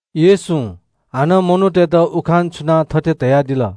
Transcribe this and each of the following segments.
येशूं हानं मनूतय्त उखान छुनाः थथे धयादिल।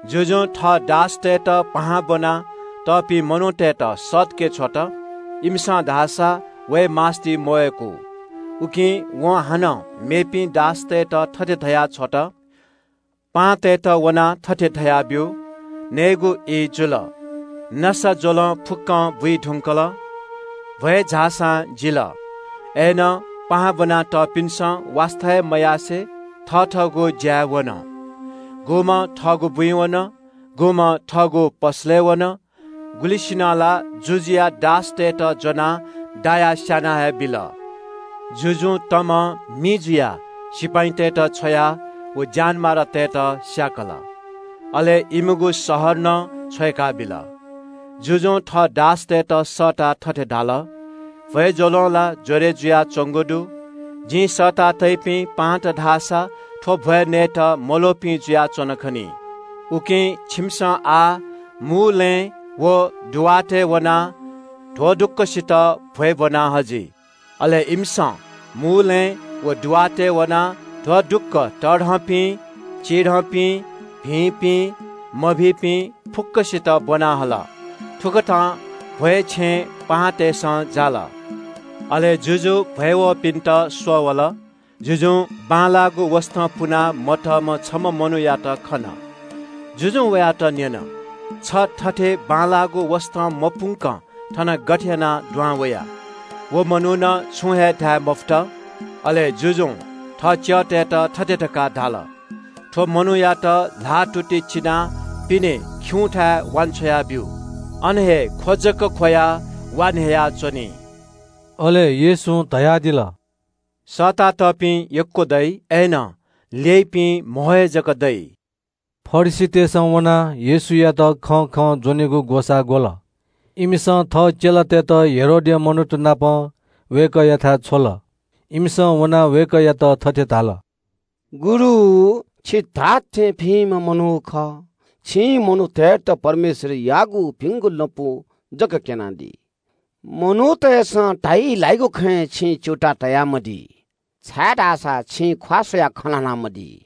जुजुं थः दासतय्त पाहां ब्वना तःपिं मनूतय्त सःतके छ्वल। इमिसं धाःसा वये मास्ति मवय्कू। “उकिं वं हानं मेपिं दासतय्त थथे धया छ्वल – ‘पाहांतय्त वनाः थथे धयाब्यु। नयेगु ई जुल। नसाज्वलं फुक्कं बुइ धुंकल। भ्वय् झाःसां जिल।’ अय्नं पाहां ब्वना तःपिन्सं वास्ता हे मयासें थथःगु ज्याय् वन। गुम्हं थःगु बुँइ वन, गुम्हं थःगु पसलय् वन। गुलिसिनं ला जुजुया दासतय्त ज्वनाः दायाः स्याना हे बिल। “जुजुं तमं मि जुयाः सिपाइँतय्त छ्वयाः व ज्यानमारातय्त स्याकल। अले इमिगु शहर नं छ्वय्काबिल। जुजुं थः दासतय्त सःताः थथे धाल – ‘भ्वय् ज्वलं ला ज्वरय् जुयाच्वंगु दु। जिं सःता तइपिं पाहांत धाःसा थ्व भ्वय् नयेत मल्वःपिं जुयाच्वन खनी। उकिं छिमिसं आः मूलँय् व पेकालँय् वनाः ध्वदुक्वसित भ्वय् ब्वना हजि।’ अले इमिसं मूलँय् व पेकालँय् वनाः ध्वदुक्व तःधंपिं, चिधंपिं, भिंपिं, मभिंपिं फुक्कसित ब्वना हल। थुकथं भ्वय् छेँ पाहांतय्सं जाल।” “अले जुजु भ्वय् वःपिन्त स्वः वल। जुजुं बांलाःगु वसतं पुना मतःम्ह छम्ह मनूयात खन। जुजुं वयात न्यन – ‘छ थथे बांलाःगु वसतं मपुंकं थन गथे यानाः दुहां वया?’ व मनुखं छुं हे धाये मफुत। अले जुजुं थः च्यःतय्त थथे धकाः धाल – ‘थ्व मनूयात ल्हाःतुति चिनाः पिने खिउँथाय् वान्छ्वया ब्यु। अन हे ख्व जक ख्वयाः वा न्ह्ययाच्वनी।’” अले येशूं धयादिल – “सःतातःपिं यक्व दइ, अय्नं ल्यइपिं कम हे जक दइ।” फरिसीतय्सं वनाः येशूयात वय्कःया खँय् हे ज्वनेगु ग्वसाः ग्वल। इमिसं थः चेलातय्त हेरोदया मनूत नाप वय्कःयाथाय् छ्वल। इमिसं वनाः वय्कःयात थथे धाल – “गुरु, छि धात्थें भिंम्ह मनू खः। छिं मनूतय्त परमेश्वरयागु भिंगु लँपु जक क्यनादी। मनूतय्सं धाइ ल्हाइगु खँय् छिं च्यूताः तयामदी, छाय्धाःसा छिं ख्वाः स्वयाः खँ ल्हानामदी।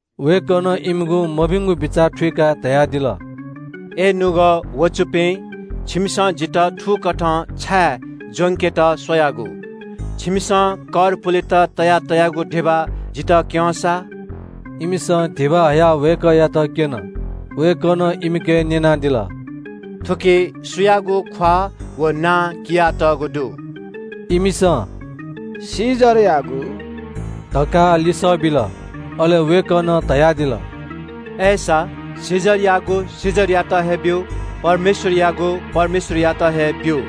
वय्कलं इमिगु मभिंगु बिचाः थुइकाः धयादिल – “अय् निपाः ख्वाःपाः दुपिं, छिमिसं जितः थुकथं छाय् ज्वंकेत स्वयागु? छिमिसं कर पुलेत तयातःगु धिबा जितः क्यँ सा।” इमिसं धिबा हयाः वय्कःयात क्यन। वय्कलं इमिके न्यनादिल – “थुकी सुयागु ख्वाः व नां कियातःगु दु?” इमिसं “कैसरयागु” धकाः लिसः बिल। अले वय्कलं धयादिल – “अय्सा कैसरयागु कैसरयात हे ब्यु, परमेश्वरयागु परमेश्वरयात हे ब्यु।”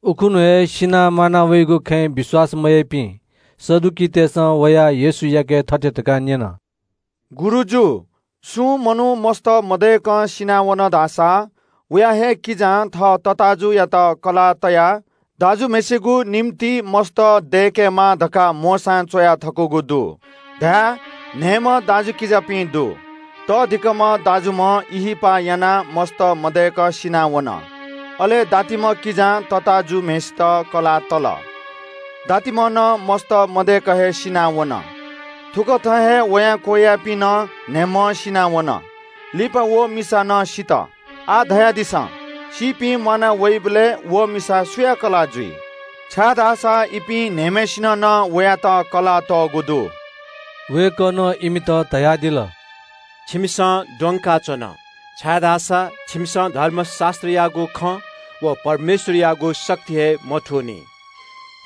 उखुन्हु हे सिनाः म्वाना वइगु खँय् विश्वास मयाइपिं सदुकीतय्सं वयाः येशूयाके थथे धकाः न्यन – “गुरुजु, सुं मनू मस्त मदय्कं सिनावन धाःसा वया हे किजां थः तताःजुयात कलाः तयाः दाजुम्हय्सिगु निंतिं मस्त दय्केमाः धकाः मोशां च्वया थकूगु दु। धाय्, न्हय्म्ह दाजुकिजापिं दु। तःधिकःम्ह दाजुम्ह ब्याहा यानाः मस्त मदय्क सिनावन। अले दातिम्ह किजां तताःजुम्हय्सित कलाः तल। दातिम्ह नं मस्त मदय्क हे सिनावन। थुकथं हे वयां क्वय्यापिं नं न्हय्म्हं सिनावन। लिपा व मिसा नं सित। आः धयादिसँ, सीपिं म्वाना वइबलय् व मिसा सुया कलाः जुइ? छाय्धाःसा इपिं न्हय्म्हय्सिनं वयात कलाः तःगु दु।” वय्कलं इमित धयादिल – “छिकपिन्सं द्वंकाच्वन, छाय्धाःसा छिकपिन्सं धर्मशास्त्रयागु खँ व परमेश्वरयागु शक्ति हे थुइकामदीनि।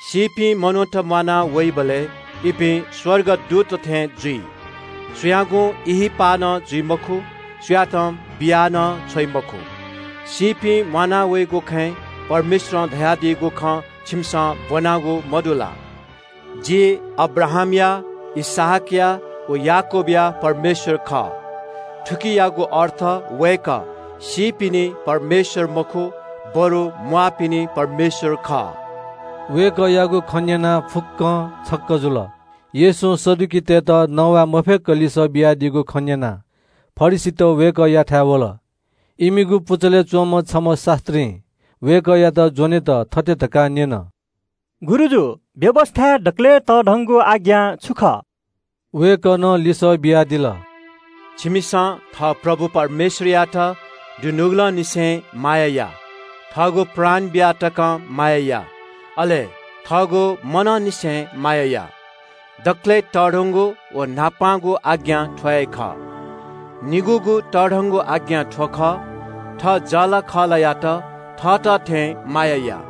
सीपिं मनूत म्वाना वइबलय् इपिं स्वर्गदूतत थें जुइ। सुयागुं ब्याहा नं जुइ मखु, सुयातं बिया नं छ्वइ मखु। “सीपिं म्वाना वइगु खँय् परमेश्वरं धयादीगु खँ छिकपिन्सं ब्वनादियागु मदु ला? ‘जि अब्राहामया, इसहाकया व याकूबया परमेश्वर खः।’ थुकियागु अर्थ वय्कः सीपिनि परमेश्वर मखु, बरु म्वाःपिनि परमेश्वर खः।” वय्कःयागु खँ न्यनाः फुक्कं छक्क जुल। येशूं सदुकीतय्त नवाये मफय्क लिसः बियादीगु खँ न्यनाः फरिसीत वय्कःयाथाय् वल। इमिगु पुचलय् च्वंम्ह छम्ह शास्त्रीं वय्कःयात ज्वनेत थथे धकाः न्यन – “गुरुजु, व्यवस्थाय् दकलय् तःधंगु आज्ञा छु खः?” वय्कलं लिसः बियादिल – “परमप्रभु झी परमेश्वरयात दुनुगलंनिसें माया या, थःगु प्राण बियाः तकं माया या, अले थःगु मनंनिसें माया या। दकलय् तःधंगु व न्हापांगु आज्ञा थ्व हे खः। निगूगु तःधंगु आज्ञा थ्व खः – थः जःलाखःलायात थःत थें माया या।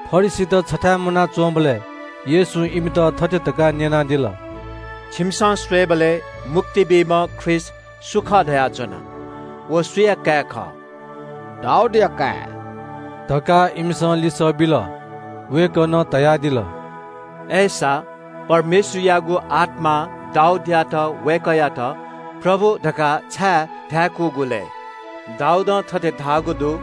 फरिसीत छथाय् मुनाच्वंबलय् येशूं इमित थथे धकाः न्यनादिल – “छिकपिन्सं स्वयेबलय् – मुक्ति बीम्ह ख्रीष्ट सु खः धयाच्वनादिया? व सुया काय् खः?” “दाऊदया काय्” धकाः इमिसं लिसः बिल। वय्कलं धयादिल – “अय्सा परमेश्वरयागु आत्मां दाऊदयात वय्कःयात ‘प्रभु’ धकाः छाय् धाय्कूगु लय्? दाऊदं थथे धाःगु दु –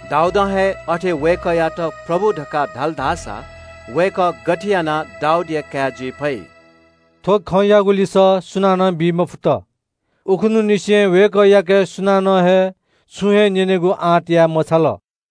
“दाऊदं हे अथे वय्कःयात ‘प्रभु’ धकाः धाल धाःसा वय्कः गथे यानाः दाऊदया काय् जुइ फइ?” थ्व खँयागु लिसः सुनानं बी मफुत। उखुन्हुंनिसें वय्कःयाके सुनानं हे छुं हे न्यनेगु आँट याये मछाल।